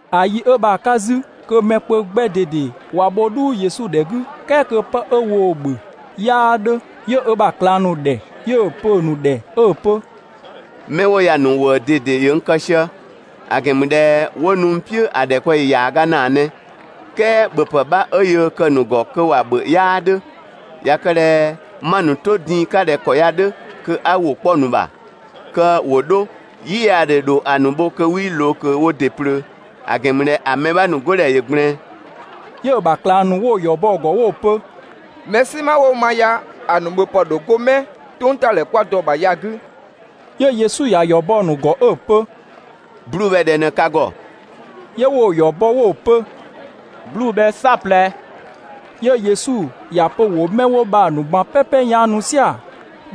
‑A yi 'ö bha‑ 'ka 'zü kö mɛ kpö 'gbɛ ꞊dede ꞊wa bho "dhuu Yesu ‑dhɛ 'gü, "kɛɛ kö 'pë 'ö woo‑ ‑bhö 'yaa 'dhö, 'yö ö ‑bha ꞊klang ‑nu ‑dhɛ, 'yö‑ pö‑ ‑nu ‑dhɛ 'ö‑ pö: «'Mɛ 'wo ya‑ ‑nu ‑wëë ꞊dede ‑yö n kë sië, ‑a ‑gɛn ‑mü ꞊dhɛ 'wo nu n "piʋ̈ ‑a ‑dhɛkpaɔyi ‑yaaga ‑naa ꞊nɛ, "kɛɛ ‑bhöpë 'bha 'ö yöö kë‑ ‑nu ‑gɔ kö ‑wa ‑bhö 'yaa 'dhö. ꞊Ya kë ꞊dhɛ 'ma‑ ‑nu 'to din‑ 'ka ꞊dhɛ ‑kɔ ya‑ 'dhö, kö 'a ‑wʋ 'kpɔ‑ ‑nu ‑bha kö ‑wo 'dho, "yiyaadhe ‑dho ‑a ‑nu bho kö 'wii ꞊loo ꞊kö wo ‑dɩ ꞊plöö, ‑a ‑gɛn ‑mü ꞊dhɛ ‑a mɛ 'bha ‑nu 'godhɛ ‑yö ꞊gblɛɛn.» 'Yö‑ ‑bha ꞊klang ‑nu 'wo ‑yɔ bɔ‑ ‑gɔ 'wo‑ pö: «Mɛ "sinma 'wo ma ya‑ ‑nu ‑bhöpë ‑dho 'go 'mɛ "tʋngtadhɛ 'kwa dɔ‑ ‑bha ya‑ 'gü?» 'Yö Yesu ‑ya ‑yɔ bɔ‑ ‑nu ‑gɔ 'ö‑ pö: «'Bluu‑ bhɛ ꞊dhɛ ꞊në ka ‑gɔ?» 'Yö 'wo‑ ‑yɔ bɔ 'wo‑ pö: «'Bluu‑ bhɛ "saɔplɛ.» 'Yö Yesu ‑ya pö ‑wo 'mɛ 'wo bha‑ ‑nu ꞊gban "pɛpɛ 'yaanu "sia‑.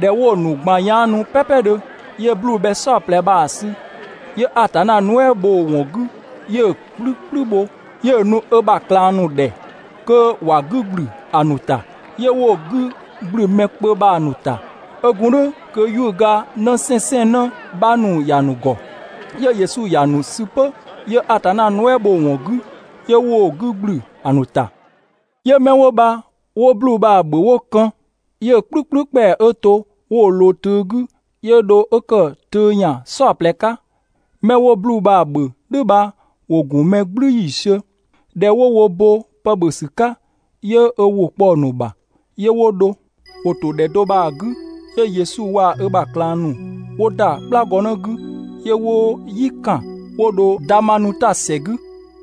꞊Dhɛ 'wo‑ ‑nu ꞊gban 'yaanu "pɛɛpɛdhö, 'yö 'bluu‑ bhɛ "saɔplɛ bha‑ sü, 'yö Atanna nuɛ" bho‑ ‑wɔn 'gü 'yö‑ "kplü "kplü bho 'yö‑ nu ö ‑bha ꞊klang ‑nu ‑dhɛ kö ‑wa 'gü ‑gblü ‑a ‑nu ‑ta. 'Yö 'wo‑ 'gü ‑gblü mɛ kpö bha‑ ‑nu ‑ta. 'Ö gun "dhʋ̈ kö 'yuʋ̈ga 'në 'sɛnsɛnnë 'bha ‑nu ‑ya ‑nu ‑gɔ. 'Yö Yesu ‑ya ‑nu sü 'pö, 'yö Atanna nuɛ" bho‑ ‑wɔn 'gü, 'yö 'wo‑ 'gü ‑gblü ‑a ‑nu ‑ta. 'Yö 'mɛ 'wo bha 'wo 'bluu‑ bha‑ ‑bhö 'wo kën, 'yö‑ "kplü "kplü ‑kpɛa 'ö to 'wo‑ ꞊loo töö 'gü, 'yö dho 'ö ‑kë töö ‑yan "saɔplɛ 'ka. 'Mɛ 'wo 'bluu‑ bha‑ ‑bhö "dhʋ̈ bha, ‑wo ‑gun mɛ "gblü ‑yiisiö. ꞊Dhɛ 'wo wo bo pë ‑bhö ‑sü 'ka, 'yö ö ‑wʋ kpɔ‑ ‑nu ‑bha, 'yö 'wo dho. ‑Wo ‑to ‑dhɛ do bha‑ 'gü, 'yö Yesu waa‑ ö ‑bha ꞊klang ‑nu 'wo ‑da "kplagɔnë 'gü, 'yö 'wo "yi ‑kan 'wo dho Damanuta ‑sɛ 'gü.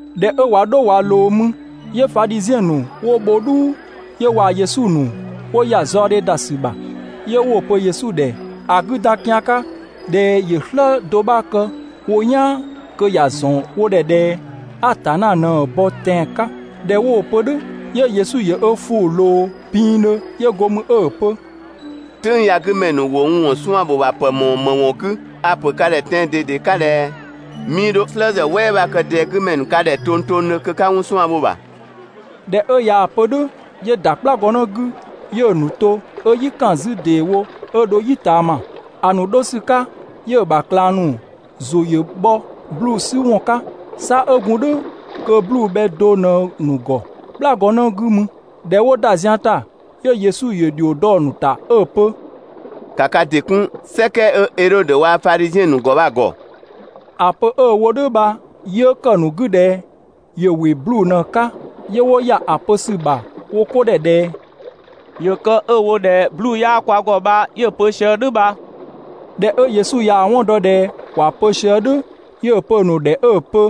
꞊Dhɛ 'ö ꞊wa 'dho ꞊wa ꞊loo mü, 'yö Fadhiziɛn ‑nu 'wo bho "dhuu, 'yö waa‑ Yesu ‑nu 'wo ‑ya zaɔdhe ‑da ‑sü ‑bha. 'Yö 'wo‑ pö Yesu ‑dhɛ ‑a 'gü dan kian 'ka ꞊dhɛ ‑yö "slë do 'bha kë wo "yaan kö ‑ya ‑zɔn wo ‑dhɛ ꞊dhɛ Atanna ꞊në‑ bɔ tɛan‑ 'ka. ꞊Dhɛ 'wo‑ pö "dhʋ̈, 'yö Yesu ‑yö ö ‑fʋʋ ꞊loo pinngdhö, 'yö go mü 'ö‑ pö: «"Tʋ̈ng ya‑ 'gü ‑mɛ ‑nu ‑wo n ‑wɔn 'suan‑ ‑bho ‑bha ‑pë ‑mɔɔ ‑më ‑wɔn 'gü? A‑ ‑pö ka ‑dhɛ tɛan‑ ꞊dede 'ka ꞊dhɛ: 'Mii 'dho "slë ‑zë "wɛɛwɛɛ 'bha kë ꞊dɛɛ 'gü ‑mɛ ‑nu ka ‑dhɛ tongtongdhö kö 'ka 'wɔn 'suan‑ bho‑ ‑bha.» ꞊Dhɛ 'ö ꞊yaa‑ pö "dhʋ̈, 'yö ‑da "kplagɔnë 'gü, 'yö‑ ‑nu to 'ö "yi ‑kan 'zü ‑deewo 'ö dho "yi ꞊taama. ‑A ‑nu 'dho ‑sü 'ka, 'yö‑ ‑bha ꞊klang ‑nu ‑zʋ ‑yö bhɔ 'bluu‑ 'sü ‑wɔn 'ka, 'sa 'ö gun "dhʋ̈ kö 'bluu‑ bhɛ do ꞊në‑ ‑nu ‑gɔ "kplagɔnë 'gü mü. ꞊Dhɛ 'wo ‑da zian ‑ta, 'yö Yesu ‑yö ‑dhio dɔ‑ ‑nu ‑ta 'ö‑ pö: «‑Ka ka ‑dɩ 'kun ꞊gɔng 'ö Edhodö waa‑ Fadhiziɛn ‑nu ‑gɔ bha‑ ‑gɔ!» ‑A pö 'ö‑ wo "dhʋ̈ bha, 'yö ‑kë ‑nu 'gü ꞊dhɛ ‑yö ‑wɩ 'bluu‑ ꞊në‑ 'ka, 'yö 'wo ‑ya ‑a pö ‑sü ‑bha wo 'ko ‑dhɛ ꞊dhɛ: «‑Yö kë 'ö‑ wo ꞊dhɛ 'bluu‑ 'yaa kwa ‑gɔ bha 'yö‑ pö sië "dhʋ̈ bha.» ꞊Dhɛ 'ö Yesu ꞊yaa‑ 'wɔn dɔ ꞊dhɛ ‑wa pö sië "dhʋ̈, 'yö‑ pö‑ ‑nu ‑dhɛ 'ö‑ pö: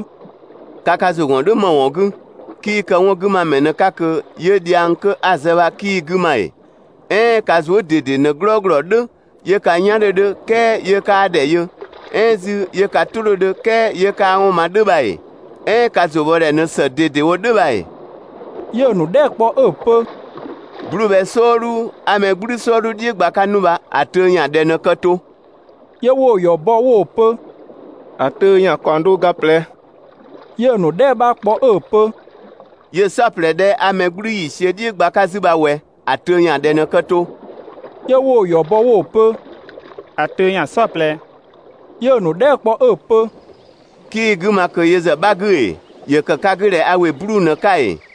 «Ka ka ‑zʋ ‑gɔn "dhʋ̈ ‑më ‑wɔn 'gü? 'Kii kë 'wɔn 'gü ma ‑mɛ ꞊në‑ 'ka ꞊kö 'yö dhiang 'kö 'a‑ zë bha 'kii‑ 'gü ma ‑ee? "Ɛɛn ka zuë" ꞊dede ꞊në "glɔɔglɔ "dhʋ̈, 'yö ka "yan 'dhö 'dhö, "kɛɛ 'yö 'kaa ‑dhɛ yö, "ɛɛn 'zü 'yö ka "tʋ 'dhö 'dhö, "kɛɛ 'yö 'kaa 'wɔn ma "dhʋ̈ bha ‑ee? "Ɛɛn ka ‑zʋ bhɔ ‑dhɛ ꞊në ‑së ꞊dedewo "dhʋ̈ bha ‑ee?» 'Yö‑ ‑nu dhɛɛ" kpɔ 'ö‑ pö: «'Bluu‑ bhɛ "sɔɔdhu 'a mɛ "gblü "sɔɔdhu "dhiʋ̈ gba‑ 'ka 'nu bha, ‑a töö ‑yan ꞊dhɛ ꞊në kë to?» 'Yö 'wo‑ ‑yɔ bɔ 'wo‑ pö: «‑A töö ‑yan ‑kaɔng do ga ꞊plɛ.» 'Yö‑ ‑nu dhɛɛ" 'bha kpɔ 'ö‑ pö: «'Yö‑ "saɔplɛ 'dhɛ 'a mɛ "gblü ‑yiisiö "dhiʋ̈ gba‑ 'ka 'zü bha ꞊wɛ, ‑a töö ‑yan ꞊dhɛ ꞊në kë to?» 'Yö 'wo‑ ‑yɔ bɔ 'wo‑ pö: «‑A töö ‑yan "saɔplɛ.» 'Yö‑ ‑nu dhɛɛ" kpɔ 'ö‑ pö: «'Kii‑ 'gü ma ꞊kö yö ‑zë 'bha 'gü ‑ee? (‑Yö ‑kë ka 'gü ꞊dhɛ a ‑wɩ 'bluu‑ ꞊në‑ 'ka ‑ee?)»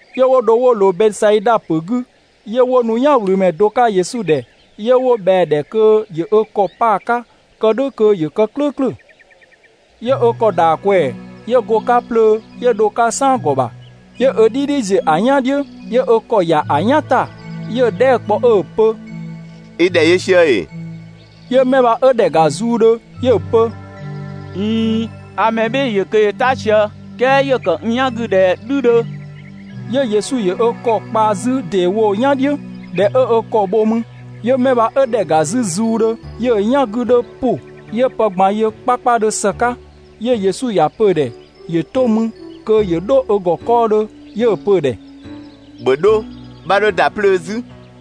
'Yö 'wo dho 'wo ꞊loo Bɛsaida ‑pö 'gü. 'Yö 'wo nu "yanwlümɛ do 'ka Yesu ‑dhɛ, 'yö 'wo ꞊bhɛa‑ ‑dhɛ kö ‑yö ö ‑kɔ pa‑ 'ka kë "dhʋ̈ kö ‑yö kë "klʋ̈ʋ̈klʋ̈. 'Yö ö ‑kɔ ‑da ꞊kwɛɛ‑, 'yö go‑ 'ka 'plöö 'yö dho‑ 'ka "saan ‑gɔ ‑bha. 'Yö ö "dhidhi ‑ziö ‑a "yan "dhiʋ̈, 'yö ö ‑kɔ ‑ya ‑a "yan ‑ta, 'yö‑ dhɛɛ" kpɔ 'ö‑ pö: «I ‑dhɛ yö sië ‑ee?» 'Yö 'mɛ bha 'ö ‑dhɛ ‑ga zuudhö, 'yö‑ pö: «꞊Iin, a mɛ "bhɩɩ‑ ‑yö kö ‑yö "ta sië, "kɛɛ ‑yö kë n "yan 'gü ꞊dhɛ "dhü 'dhö.» 'Yö Yesu ‑yö ö ‑kɔ kpa 'zü ‑deewo "yan "dhiʋ̈, ꞊dhɛ 'ö ö ‑kɔ bho mü, 'yö 'mɛ bha 'ö ‑dhɛ ‑ga 'zü zuudhö, 'yö‑ "yan 'gü 'dhö ‑pʋ, 'yö pë ꞊gban yö 'kpakpadhö ‑së 'ka. 'Yö Yesu ‑ya pö‑ ‑dhɛ ‑yö 'to mü kö ‑yö 'dho ö ‑gɔ 'kɔɔdhö, 'yö‑ pö‑ ‑dhɛ: «‑Bhö 'dho, 'bha 'dho ‑da 'plöö 'zü!»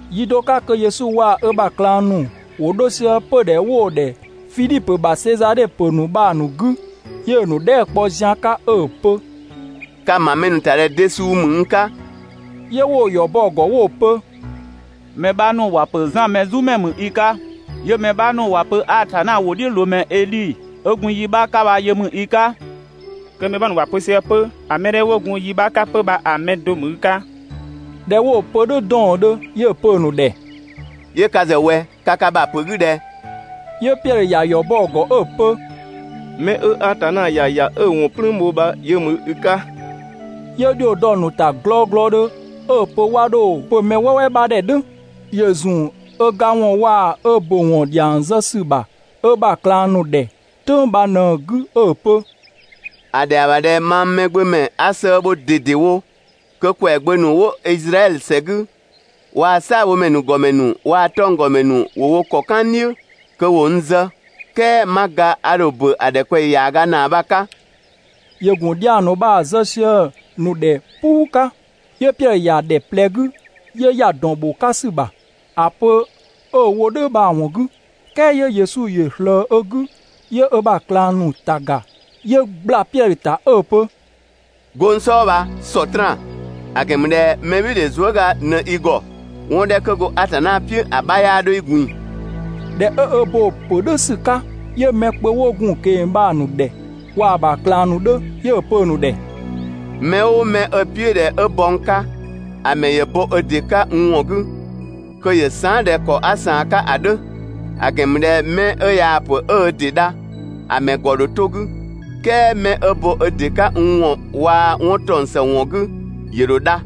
Yi do 'ka kö Yesu waa‑ ö ‑bha ꞊klang ‑nu ‑wo 'dho sië 'pödhɛ 'wo‑ ‑dhɛ Fidhipö ‑bha Sezadhe ‑pö ‑nu bha‑ ‑nu 'gü, 'yö‑ ‑nu dhɛɛ" kpɔ zian 'ka 'ö‑ pö: «Ka‑ ‑ma mɛ ‑nu ‑ta ꞊dhɛ de suu ‑mü n 'ka?» 'Yö 'wo‑ ‑yɔ bɔ‑ ‑gɔ 'wo‑ pö: «Mɛ 'bha ‑nu ‑wa ‑pö Zan Mɛzumɛ ‑mü i 'ka, 'yö‑ mɛ 'bha ‑nu ‑wa pö Atanna ‑wʋdhiʋ̈loomɛ Edhi ('ö gun yi 'bha 'ka bha yö) ‑mü i 'ka, kö mɛ 'bha ‑nu ‑wo pö sië 'pö ‑a mɛ 'dhɛ 'wo gun yi 'bha 'ka 'pö bha‑ mɛ do ‑mü i 'ka.» ꞊Dhɛ 'wo‑ pö "dhʋ̈ 'dɔɔndhö, 'yö‑ pö‑ ‑nu ‑dhɛ: «Yö ka ‑zë ꞊wɛ? Ka ka ‑bha ‑pö 'gü ꞊dhɛ?» 'Yö Piɛdhö ‑ya ‑yɔ bɔ‑ ‑gɔ 'ö‑ pö: «'Mɛ 'ö Atanna ‑ya ‑ya 'ö‑ ‑wɔn "plüün bho bha, yö ‑mü i 'ka.» 'Yö ‑dhio dɔ‑ ‑nu ‑ta glɔglɔdhö 'ö‑ pö 'wa 'dho‑ pö mɛ "wɛɛwɛɛ 'bha ‑dhɛ "dhʋ̈. ‑Yö ‑zun ö ga ‑wɔn waa‑ ö ‑bö ‑wɔn ‑dhiang zë ‑sü ‑bha ö ‑bha ꞊klang ‑nu ‑dhɛ "tʋ̈ng bha ꞊në‑ 'gü 'ö‑ pö: «‑A ‑dhɛa ‑bha ꞊dhɛ mang Mɛgbömɛ 'a sëë bho ꞊dedewo, kö ‑kwɛagbö ‑nu 'wo Izraɛdhö ‑sɛ 'gü waa‑ "saabhomɛ ‑nu ‑gɔmɛ ‑nu waa‑ 'tɔnggɔmɛ ‑nu ‑wo wo ‑kɔ "kan n "dhiʋ̈, kö ‑wo n zë, "kɛɛ 'ma ga a ‑dho ‑bö ‑a ‑dhɛkpaɔyi ‑yaaga ‑naa bha‑ 'ka. ‑Yö ‑gun dhiang ‑nu bha‑ zë sië‑ ‑nu ‑dhɛ "puu 'ka. 'Yö Piɛdhö ‑ya ‑dhɛ ꞊plɛ 'gü, 'yö ‑ya ‑dɔn ‑bho 'ka ‑sü ‑bha (‑a pö 'ö‑ wo "dhʋ̈ bha‑ ‑wɔn 'gü). "Kɛɛ 'yö Yesu ‑yö ꞊slëë ö 'gü 'yö ö ‑bha ꞊klang ‑nu ‑ta ‑ga, 'yö ꞊gbla Piɛdhö ‑ta 'ö‑ pö: «'Go n "sɔɔ bha, Sɔtraan! ‑A ‑gɛn ‑mü ꞊dhɛ mɛbhɩɩdhe zuëga ꞊në i ‑gɔ, 'wɔn 'dhɛ 'kö go Atanna "piʋ̈ ‑a 'bha 'yaa 'dho i ꞊gbin‑.» ꞊Dhɛ 'ö ö bo‑ ‑pö "dhʋ̈ ‑sü 'ka, 'yö mɛ kpö 'wo gun‑ ꞊keng‑ bha‑ ‑nu ‑dhɛ, waa‑ ‑bha ꞊klang ‑nu 'dhö, 'yö‑ pö‑ ‑nu ‑dhɛ: «Mɛ "ʋʋ mɛ 'ö‑ "piʋ̈ ꞊dhɛ 'ö bɔ n 'ka, ‑a ‑mɛ ‑yö bo ö ‑dɩ 'ka n ‑wɔn 'gü, kö ‑yö saan" ꞊dhɛ ‑kɔ 'a ꞊saan‑ 'ka ‑a 'dhö. ‑A ‑gɛn ‑mü ꞊dhɛ 'mɛ 'ö yaa‑ ‑pö 'ö ö ‑dɩ dha, ‑a ‑mɛ ‑gɔ ‑dho 'to‑ 'gü, "kɛɛ mɛ 'ö bo ö ‑dɩ 'ka n ‑wɔn waa‑ 'wɔn ‑taɔng ‑së ‑wɔn 'gü, ‑yö ‑dho dha.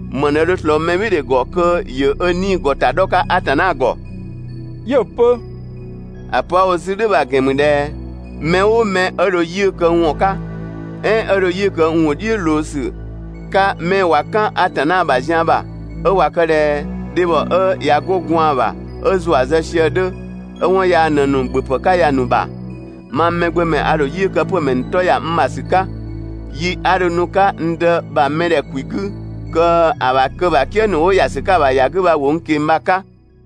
‑Më ꞊në dho ꞊slɔɔ mɛbhɩɩdhe ‑gɔ kö ‑yö ö 'nii‑ ‑gɔ ‑ta 'dhɔ‑ 'ka Atanna ‑gɔ?» 'Yö‑ pö: «‑A pö 'a‑ wo 'zü "dhʋ̈ bha‑ ‑gɛn ‑mü ꞊dhɛ mɛ "ʋʋ mɛ 'ö dho 'yiʋ̈‑ kë n ‑wɔn 'ka, "ɛɛn 'ö dho 'yiʋ̈‑ kë n ‑wʋ "dhiʋ̈ ꞊loo ‑sü 'ka 'mɛ ꞊wa "kan Atanna ‑bha zian ‑bha 'ö ꞊wa kë ꞊dhɛ dhebhɔ 'ö ꞊ya 'go gwaan‑ bha 'ö ‑zua zë sië‑ 'dhö, 'ö 'wɔn yaa ꞊në‑ ‑nu ‑bhöpë 'ka ya‑ ‑nu ‑bha, mang Mɛgbömɛ a ‑dho 'yiʋ̈‑ kë 'pö‑ ‑mɛ ‑nu 'tɔ ‑ya n ‑bha ‑sü 'ka yi 'a dho nu‑ 'ka n Dë ‑bha mɛdhɛ ‑kwi 'gü kö‑ ‑bha "kië ‑nu 'wo ‑ya ‑sü 'ka‑ ‑bha ‑ya 'gü bha ‑wo n ꞊keng‑ bha‑ 'ka.